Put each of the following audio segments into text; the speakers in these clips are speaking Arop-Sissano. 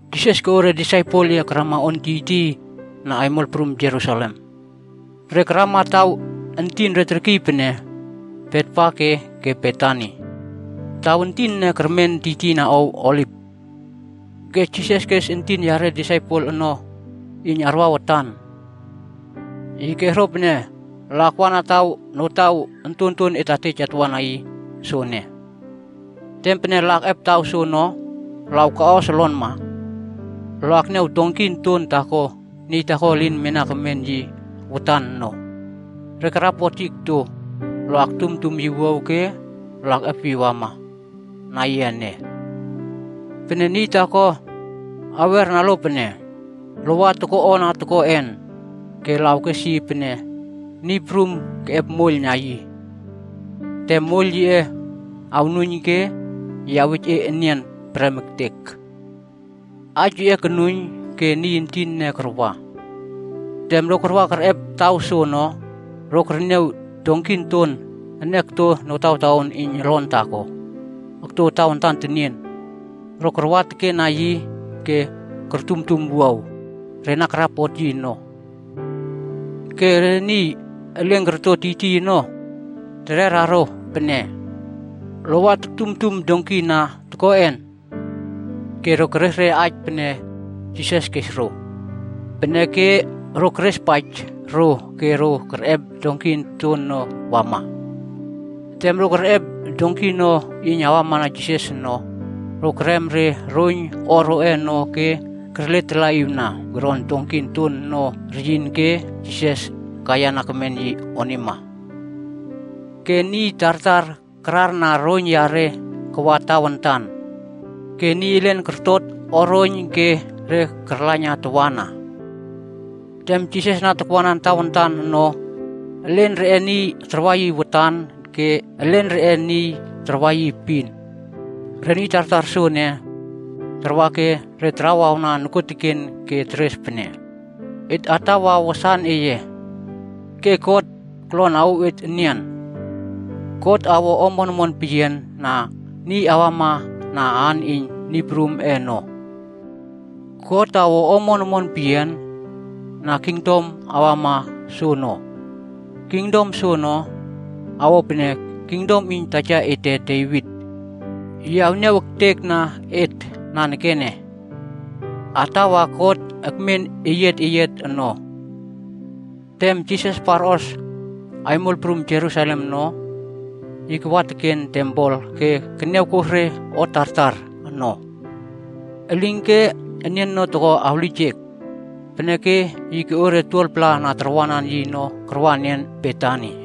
Jisas koꞌo re disaipel yiꞌe ono karama on tiytiy na aimol prum Jerusalem. Re karamana taw entin re terkiy pene Betfage ke Betani. Taw ontonton entin ene kermen tiytiyna ow Oliv. Ke Jisas kes entin yare disaipel ono iyn arwa watan. Yi kes ro pene, “Lo akwa na taw notaw ontonton et na tej atwa na yi soene. Tem pene lo wa akꞌep taw soono ke awkaꞌos olonma, lo akniaw donki onton taako niy taako elin mena kemen yi watan ono, re karapot yi okto. Lo aktumtum wuaw ke lo akꞌep yi awama ene. Pene niy taako awera lo pene lo wa toko o ana tokoꞌen, ke lo awkes yi pene, ‘Niy Prum keꞌep moiyl na yi. Tem moiyl yiꞌe awnuiyn ke yi awej e enian prem ektek.’” Aij yiꞌe konuiyn ke niy entin ene karwa. Tem ro wa kerꞌep taw soono, ro kerniaw donki onton ene okto notawtaon iyn olon taako okto tawantan tenien. Ro karwa tekena yi ke kortumtum wuaw re na karapot yi ono. Ke re niy elen korto tiytiy ono, re tererna ro pene, “Lo wa toktumtum donki ana tokoꞌen?” Ke ro keres re aij pene Jisas kes ro. Peneke re kerespaij ro ke ro kerꞌep donki onton ono kawa. Tem ro kerꞌep donki ono iyn wamana Jisas ono, ro kerem re roiyn o roꞌe ono ke kerletalaꞌiwna koron donki onton ono reyin ke Jisas kaiyana kemen yi onima. Ke niy tartar kararna roiyn yare kawa tawantan. Ke niy elen kortot o roiyn ke re karlaiyna tawana. Tem Jisas na takwanan tawantan ono, elen reꞌe niy ono tarwa yi watan ke elen reꞌe tarwanan yi epin. Re niy tartar soene, tarwa ke re tarawawna nokuoteken ke teres pene, “Et atawa wasan eye. Ke God kolon awouw et enian! God awo omon omon peyian na niy awama na aan iyn Niy Prumꞌe ono. God awo omon omon peyian na kingdom awama soono. Kingdom soono, awo pene kingdom iyn taja ete, Devit. Yi awniaw ektekna et nanekene. Atawa God akmen eyiat eyiat ono!” Tem Jisas parꞌos aimol prum Jerusalem ono, yi kawa teken tempel ke keniawkos re o tartar ono. Elinke nian ono toko awlijek, peneke yi koꞌo re niy 12-pla na tarwanan yi ono karwa enian Betani.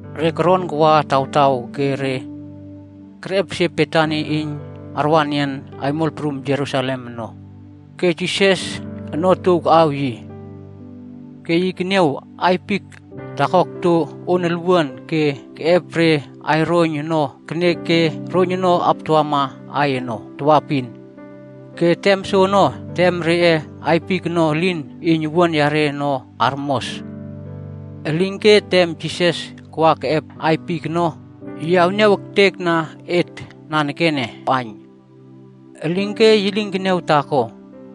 Re koron wa tawtaw ke re kerꞌepesie Betani iyn re arwa enian aimol prum Jerusalem ono, ke Jisas ono otuow kaꞌaw yi. Ke yi keniaw aiy fik taako okto on olwuana ke keꞌep re aiy roiyn ono kenek ke roiyn ono aptawamana aiy ono tawaepin. Ke tem soono, tem reꞌe aiy fik ono elin iyn owuan reꞌe ono armos. Elinke tem Jisas wa keꞌep aiy fik ono, yi niawtek re fik owuan lomuat ono iyn yi awꞌaiyn. Elinke yi lin keniaw taako,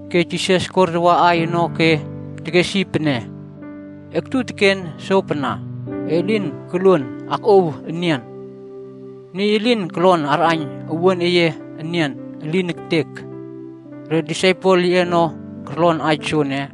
Ke Jisas kortawa aiy ono ke tekes yi pene, “Aktu teken sopana ke elin koluon akꞌuow enian. Niy elin kolon arꞌaiyn owuan eye enian. Elin ektek!” Re disaipel yiꞌe ono korlon aij soene.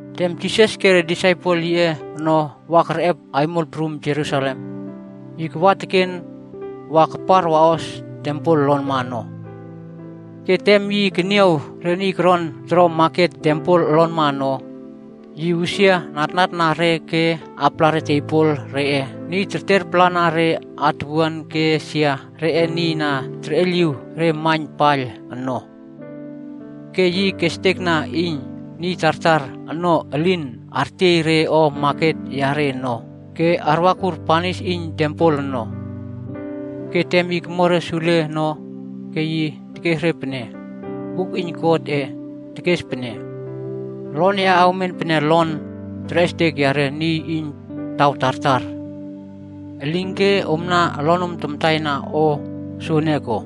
Tem Jisas ke re disaipel yiꞌe ono wama kerꞌep aimol prum Jerusalem, yi kawa teken wa kapar waꞌos tempel olonma ono. Ke tem yi keniaw re niy koron toro maket tempel olonma ono, yi usia natnatna re ke apala re tebol reꞌe niy tertiapalana re atuwuan ke sia reꞌe niy na terꞌeiyliw re maiyn paiyl ono. Ke yi kestekna iyn niy tartar ono elin artiey re o maket yare ono ke arwakur banis iyn tempel ono. Ke tem yi komo re sule ono, ke yi tekes re pene, “Buk iyn Godꞌe tekes pene, ‘Olon yaꞌe awmen pene olon terꞌestek yare niy iyn taw tartar.’ Elinke omna olonom kamtaina o soene ko?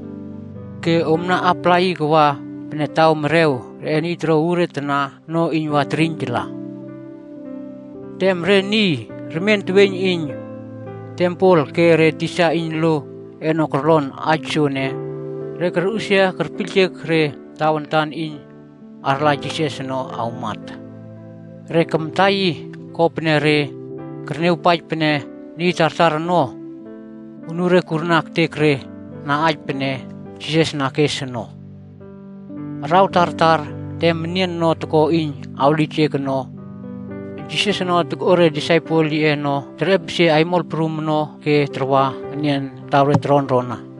Ke om na apala yi kawa pene taw merew reꞌe niy toro uure tana ono iyn wa terꞌiynjala.” Tem re niy remien teweiyn iyn tempel ke re tisa iyn lo ono korlon aij soene, re korꞌusia kerpiyljek re tawantan iyn arla Jisas ono awmat. Re kamta yi, kopene re kerniawpaij pene niy tartar ono, anure kurna ektek re na aij pene Jisas na kes ono. Araw tartar, tem nian ono toko iyn awlijek ono, Jisas ono tokꞌo re disaipel yiꞌe ono terꞌepesie aimol prum ono ke tarwa enian taw re toronrona ono.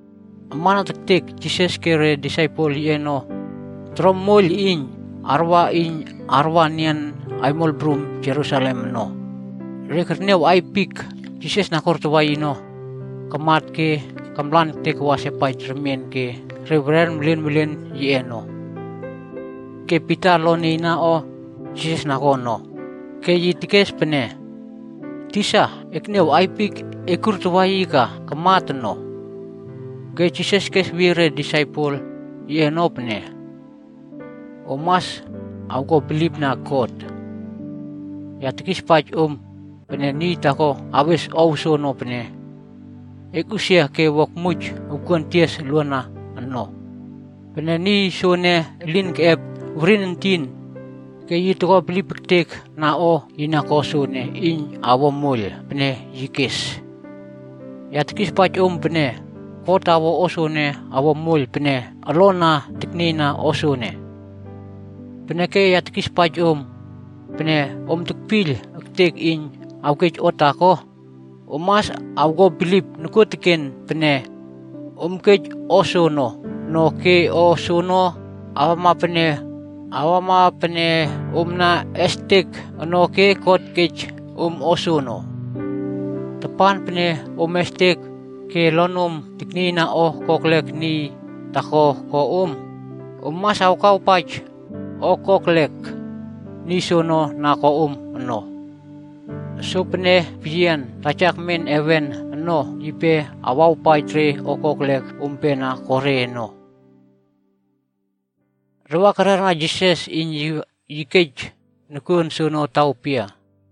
Amana tektek Jisas ke re disaipel yiꞌe ono toro moiyl iyn tarwa iyn arwa enian aimol prum Jerusalem ono, re kerniaw aiy fik Jisas na kortawa yi ono, kamat ke kamlan ektek wa sepaij remien ke re weren welenwelen yiꞌe ono. Ke Pita olon nieiyna o Jisas na ko ono ke yi tekes pene, “Tisa, ekniaw aiy fik e kurtawa yi ka, kamat ono.” Ke Jisas kesweyie re disaipel yiꞌe ono pene, “Om mas awko bilipna God. Ya tekispaij om, pene niy taako awes ow soene pene, ‘Ekꞌusia ke wua akmuij okuon tias oluana ono.’ Pene niy soene elin keꞌep werin entin, ke yi toko bilip ektek na o yi na ko soene iyn awo moiyl pene yi kes. Ya tekispaij om pene, God awo o soene awo moiyl pene olon na teknieyna soono. Peneke ya tekispaij om, pene om tekpiyl ektek iyn awkej o taako, om mas awko bilip nokuoteken pene om kej o soono ono ke o soono awama pene om na estek ono ke God awej om o soono. “Tapan pene om akꞌiestek, ke olonom aknieiyna o kokelek niy taako ko om, om mas awkuawpaij o kokelek niy soono na ko om ono. Sopene peyian Taja akmen heven ono, yipe awawpaij re o kokelek ompe na ko re ono.” Re kererna Jisas iyn yi wa kej nokuon soono taw pia?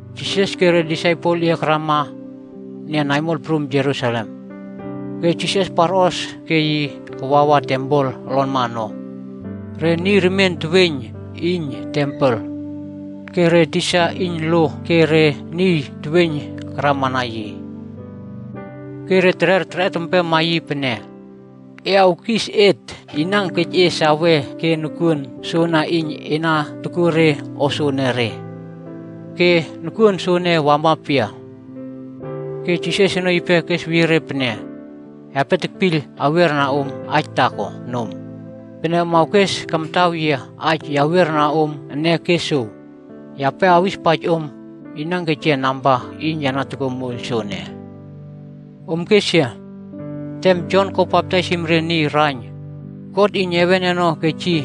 Jisas ke re disaipel yiꞌe karama enian aimol prum Jerusalem. Ke Jisas parꞌos ke yi kawawa tempel olonma ono. Re niy remien teweiyn iyn tempel, ke re tisa iyn lo ke re niy teweiyn karamana yi. Ke re terer torꞌot empema yi pene, “E awkis et, inan kej e sawe ke nokuon soana iyn e na tokuo re o soanare? Ke nokuon soana wama pia?” Ke Jisas ono tekesweyie re pene, “Yape tekpiyl awiera om aij taako nom. Pene om awkes kamtaw yia aij ya awierna om ene ke jow, yape awispaij om niy na kej yia namba iyn ya toko moiyl soene. Om kes yia. Tem Jon ko baptaisim re niy raiyn, God iyn heven ono kej yi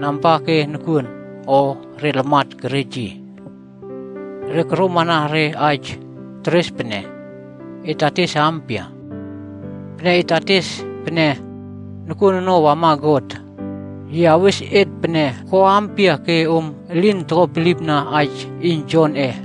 namba ke nokuon, o re niy lamat kerej yi?” Re koromana re aij teres pene, “Et wa ates ampia? Pene et ates pene nokuon ono wama God, yi awes et pene ‘Ko ampia ke om elin ko bilipna aij iyn Jonꞌe?’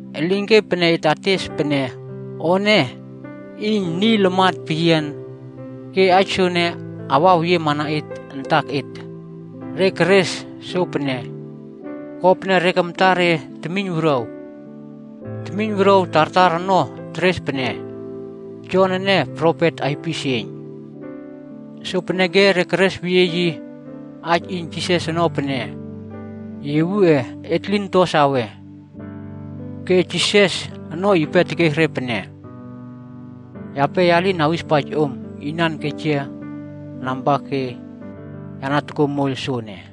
Elinke pene et ates pene ‘O ene iyn niy lamat peyian,’ ke aij soene awaweyiema na et antaket.” Re keres sopene, kopene re kamta re temiyn wuruaw. Temiyn wuruaw tartar ono teres pene Jon ene profet aipisieiyn. Sopeneke re keresweyie aij iyn Jisasꞌe ono pene, “Yiwuꞌe, et lin to sawe.” Ke Jisas ono yipe tekes re pene, “Yape lin awispaij om na inan kej yia namba ke ya na toko moiyl soene.”